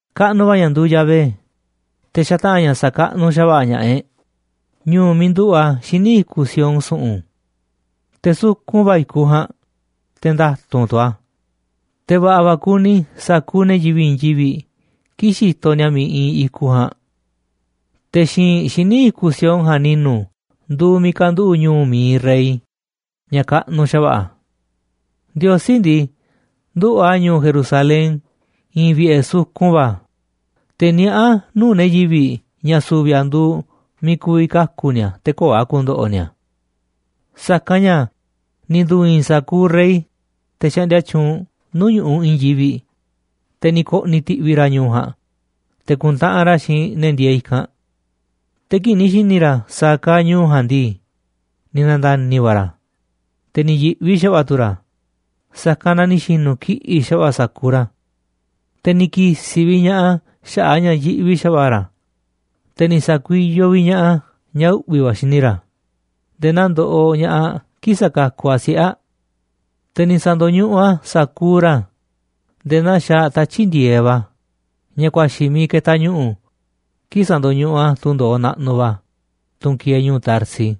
Kaꞌnuꞌ va̱ ña̱ nduuꞌ Yahvé, te̱ xataꞌa̱n ña̱ sa̱kaꞌnuꞌ xa̱va̱ꞌa̱ ña̱ꞌaꞌ e̱ꞌ ñu̱u̱ miiꞌ nduꞌu̱ꞌ a̱ xíniꞌ i̱kuꞌ Sión su̱ꞌu̱n. Te̱ sukun va̱ i̱kuꞌ ja̱a̱nꞌ, te̱ nda̱tu̱nꞌ tu̱ a̱, te̱ va̱ꞌa̱ va̱ kuni sa̱kuuꞌ ne̱ yivi̱ꞌ i̱i̱n yivi̱ꞌ kii̱ꞌ xitoꞌ ni̱a̱ miiꞌ iinꞌ i̱kuꞌ ja̱a̱nꞌ. Te̱ xi̱i̱nꞌ xíniꞌ i̱kuꞌ Sión ja̱a̱nꞌ ni̱nu̱ nduuꞌ miiꞌ ka̱nduꞌu̱ꞌ ñu̱u̱ mi̱iꞌ Rey ña̱ kaꞌnuꞌ xa̱va̱ꞌa̱. Ndiosí ndii, nduꞌu̱ꞌ a̱ ñu̱u̱ Jerusalén i̱i̱n vi̱ꞌe̱ sukun va̱, te̱ niaꞌá a̱ nuu̱ꞌ ne̱ yivi̱ꞌ ña̱ su̱vi̱ a̱ nduuꞌ miiꞌ ku̱vi̱ kaku̱ ni̱a̱ te̱ köo̱ꞌ a̱ ku̱ndo̱ꞌo̱ ni̱a̱. Sa̱kanꞌ ña̱ ni̱ ndu̱i̱i̱n sa̱kuuꞌ rey, te̱ xaꞌndia tyuunꞌ nuu̱ꞌ ñu̱ꞌuꞌ i̱i̱n yivi̱ꞌ, te̱ ni̱ ko̱ꞌni̱ ti̱ꞌvi̱ ra̱ ñu̱u̱ ja̱a̱nꞌ te̱ ku̱ntaꞌanꞌ ra̱ xiinꞌ ne̱ ndieeꞌ i̱kanꞌ. Te̱ kii̱ꞌ ni̱ xi̱ni̱ ra̱ sa̱a̱ kaaꞌ ñu̱u̱ ja̱a̱nꞌ ndii, ni̱ na̱nda̱ni̱ va̱ ra̱, te̱ ni̱ yi̱ꞌvi xa̱va̱ꞌa̱ tu̱ ra̱, sa̱kanꞌ na ni̱ xi̱nu̱ kiꞌi̱ꞌ xa̱va̱ꞌa̱ sa̱kuuꞌ ra̱. Te̱ ni̱ ki̱si̱ vi̱ꞌ ña̱ꞌaꞌ a̱ xaꞌa̱ꞌ a̱ ña̱ yiꞌvi xa̱va̱ꞌa̱ ra̱, te̱ ni̱ sa̱kuiyoꞌ vi̱ꞌ ña̱ꞌaꞌ a̱ ña̱ uꞌvi̱ va̱ xini ra̱, nde̱e̱ naa ndoꞌoꞌ ña̱ꞌaꞌ kii̱ꞌ sakakuꞌ aꞌ siꞌe̱ aꞌ. Te̱ ni̱ sa̱ndo̱ñuꞌuꞌ a̱ sa̱kuuꞌ ra̱ nde̱e̱ naa xaaꞌ tatyi̱ꞌ ndi̱e̱eꞌ va̱, ña̱ ku̱a̱xi̱ miiꞌ ketaꞌ ñu̱ꞌu̱ kii̱ꞌ sandoñuꞌuꞌ a̱ tundo̱oꞌ naꞌnuꞌ va̱, tunꞌ kieeꞌ ñu̱u̱ Tarsis.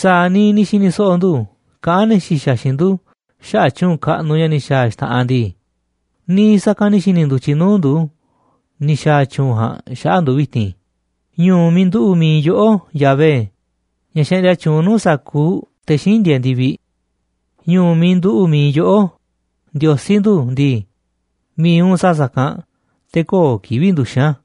Sa̱a̱ niiꞌ ni̱ xi̱ni̱ so̱ꞌo̱ ndu̱ kaꞌán ne̱ xi̱xa̱ xiinꞌ ndu̱ xaꞌa̱ꞌ tyu̱u̱n kaꞌnuꞌ ña̱ ni̱ xa̱a̱ a̱ xta̱ꞌanꞌ ndii, niiꞌ sa̱kanꞌ ni̱ xi̱ni̱ ndu̱tyiꞌ nuu̱ꞌ ndu̱ ni̱ xa̱a̱ a̱ tyu̱u̱n ja̱a̱nꞌ xaꞌa̱ꞌ ndu̱ vi̱ti̱n ñu̱u̱ miiꞌ nduꞌu̱ꞌ mií yoꞌó, Yahvé, ña̱ xaꞌndia tyuunꞌ nuu̱ꞌ sa̱kuuꞌ te̱ xíinꞌ ndieeꞌ ndi̱viꞌ. Ñu̱u̱ miiꞌ nduꞌu̱ꞌ mi̱iꞌ yoꞌó, Ndiosí ndu̱ ndii, mi̱iꞌ u̱nꞌ sa̱a̱ sa̱kanꞌ te̱ köo̱ꞌ kivi̱ꞌ nduxi̱n a̱.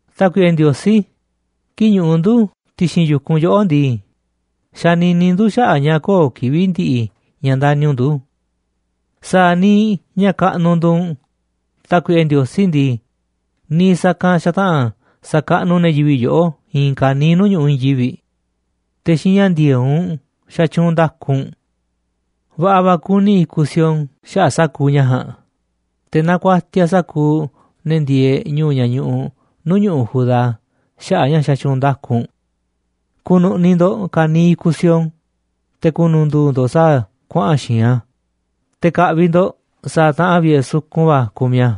Tákuiꞌe Ndiosí, kii̱ꞌ ñuꞌuꞌ ndu̱ ti̱xi̱n yu̱kunꞌ yoꞌó ndii, xanini ndu̱ xaꞌa̱ꞌ ña̱ köo̱ꞌ kivi̱ꞌ ndiꞌiꞌ ña̱ ndani̱ u̱nꞌ ndu̱. Sa̱a̱ niiꞌ ña̱ kaꞌnuꞌ nduuꞌ u̱nꞌ, Tákuiꞌe Ndiosí ndii, niiꞌ sa̱kanꞌ xataꞌa̱n sa̱kaꞌnuꞌ ne̱ yivi̱ꞌ yoꞌó i̱i̱n ka̱niiꞌ nuu̱ꞌ ñu̱ꞌuꞌ i̱i̱n yivi̱ꞌ. Te̱ xiinꞌ ña̱ ndi̱e̱eꞌ u̱nꞌ xatyuunꞌ nda̱ku u̱nꞌ. Va̱ꞌa̱ ku̱ni̱ i̱kuꞌ Sión xaꞌa̱ꞌ sa̱kuuꞌ ña̱ ja̱a̱nꞌ, te̱ nakuatiaꞌ sa̱kuuꞌ ne̱ ndieeꞌ ñu̱u̱ ña̱ ñuꞌuꞌ nuu̱ꞌ ñu̱ꞌuꞌ Judá xaꞌa̱ꞌ a̱ ña̱ xatyuunꞌ nda̱ku u̱nꞌ. Ku̱nu̱ꞌni̱ ndo̱ꞌ ka̱niiꞌ i̱kuꞌ Sión, te̱ ku̱nu̱ndu̱u̱ ndo̱ꞌ sa̱a̱ kuaꞌa̱n xi̱i̱nꞌ a̱, te̱ ka̱ꞌvi̱ ndo̱ꞌ sa̱a̱ taꞌanꞌ vi̱ꞌe̱ sukun va̱ kumiꞌ a̱.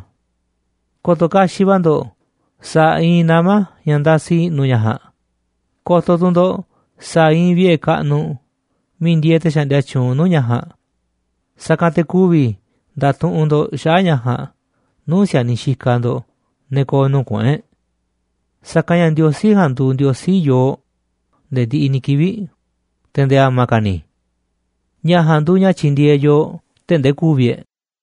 Ko̱to̱ kaxiꞌ va̱ ndo̱ꞌ sa̱a̱ iinꞌ nama̱ ña̱ ndasiꞌ i̱ꞌnu̱ ña̱ ja̱a̱nꞌ, ko̱to̱ tu̱ ndo̱ꞌ sa̱a̱ iinꞌ vi̱ꞌe̱ kaꞌnuꞌ miiꞌ ndieeꞌ te̱ xaꞌndia tyuunꞌ nuu̱ꞌ ña̱ ja̱a̱nꞌ, sa̱kanꞌ te̱ ku̱vi̱ nda̱tuꞌunꞌ ndo̱ꞌ xaꞌa̱ꞌ ña̱ ja̱a̱nꞌ nuu̱ꞌ si̱a̱niꞌ xikaꞌ ndo̱ꞌ, ne̱ ko̱o̱ nuu̱ꞌ kuꞌu̱n e̱ꞌ. Sa̱kanꞌ ña̱ Ndiosí ja̱a̱nꞌ nduuꞌ Ndiosí yooꞌ nde̱e̱ ndiꞌiꞌ ni̱ kivi̱ꞌ, te̱ nde̱e̱ a̱ma̱ ka̱ ni̱. Ña̱ ja̱a̱nꞌ nduuꞌ ña̱ tyi̱ndi̱e̱eꞌ yooꞌ tee̱ꞌ ndee ku̱vi̱ e̱ꞌ.